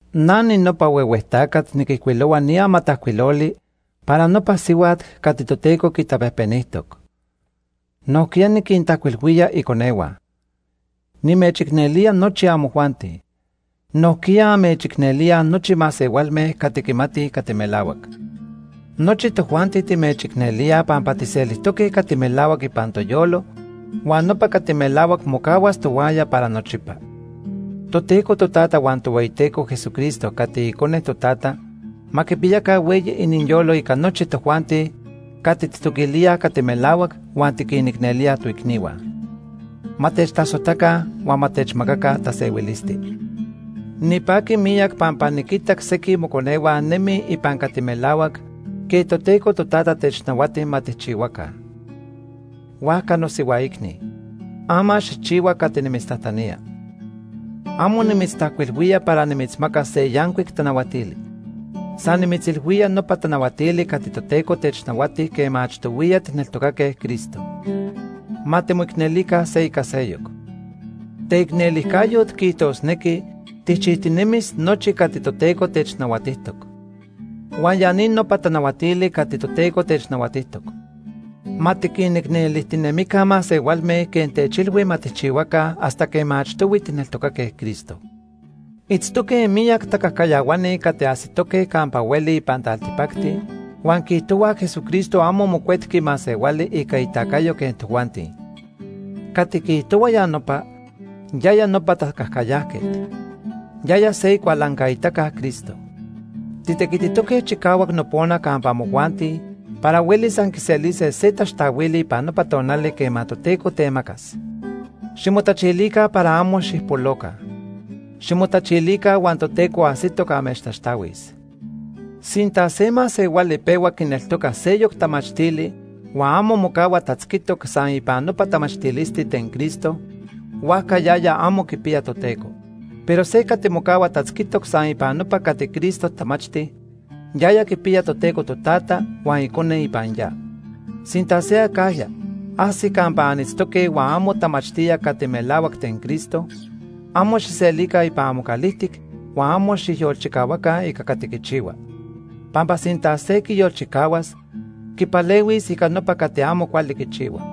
Na ninopa huehue tacat niquijcuilohua ni amatajcuiloli para nopa sihuat cati Toteco quitapejpenijtoc. Nojquiya niquintajcuilhuía iconehua. Nimechicnelía nochi amojuanti. Nojquiya amechicnelíaj nochi masehualme cati quimatij cati melahuac. Nochi tojuanti timechicnelíaj pampa tijselijtoque cati melahuac ipan toyolo huan nopa cati melahuac mocahuas tohuaya para nochipa. Toteco Totata huan Tohueyiteco Jesucristo cati Icone Totata ma quipiyaca hueyi iniyolo ica nochi tojuanti cati tijtoquilíaj cati melahuac huan tiquinicnelíaj toicnihua. Ma techtasojtaca huan ma techmacaca tasehuilisti. Nipaqui miyac pampa niquitac sequij moconehua nemij ipan cati melahuac quej Toteco Totata technahuati ma tijchihuaca. Huajca nosihuaicni, ama xijchihua cati nimitztajtanía. Amo nimitztajcuilhuía para nimitzmacas se yancuic tanahuatili. San nimitzilhuía nopa tanahuatili cati Toteco technahuati quema achtohuiya tijneltocaque Cristo. Ma timoicnelica se ica seyoc. Teicnelijcayot quiijtosnequi tijchijtinemis nochi cati Toteco technahuatijtoc. Huan ya ni nopa tanahuatili cati Toteco technahuatijtoc: Ma tiquinicnelijtinemica masehualme quej techilhui ma tijchihuaca hasta quema achtohui tijneltocaque Cristo. Itztoque miyac tacajcayahuani cati ajsitoque campa hueli ipan taltipacti huan quiijtohuaj Jesucristo amo mocuetqui masehuali ica itacayo quej tojuanti. Cati quiijtohua ya nopa, yaya nopa tacajcayajquet. Yaya se icualancaitaca Cristo. Titequititoque chicahuac nopona campa amojuanti para huelis anquiselise se taxtahuili ipan nopa tonali quema Toteco temacas. Ximotachilica para amo xijpoloca. Ximotachilica huan Toteco ajsitoc amechtaxtahuis. Sinta se masehuali pehua quineltoca seyoc tamachtili huan amo mocahua tatzquitoc san ipan nopa tamachtilisti ten Cristo, huajca yaya amo quipiya Toteco. Pero se cati mocahua tatzquitoc san ipan nopa cati Cristo tamachti, yaya quipiya Toteco Totata huan Icone ipan ya. Sinta se acajya, ajsi campa anitztoque huan amo tamachtía cati melahuac ten Cristo, amo xijselica ipan amocalijtic huan amo xijyolchicahuaca ica cati quichihua. Pampa sinta se quiyolchicahuas, quipalehuis ica nopa cati amo cuali quichihua.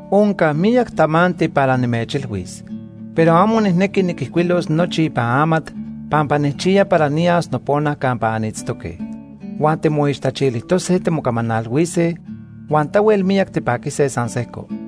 Onca miyac tamanti para nimechilhuis, pero amo nijnequi niquijcuilos nochi ipan amat pampa nijchiya para niyas nopona campa anitztoque. Huan timoixtachilijtose timocamanalhuise huan tahuel miyac tipaquise san sejco.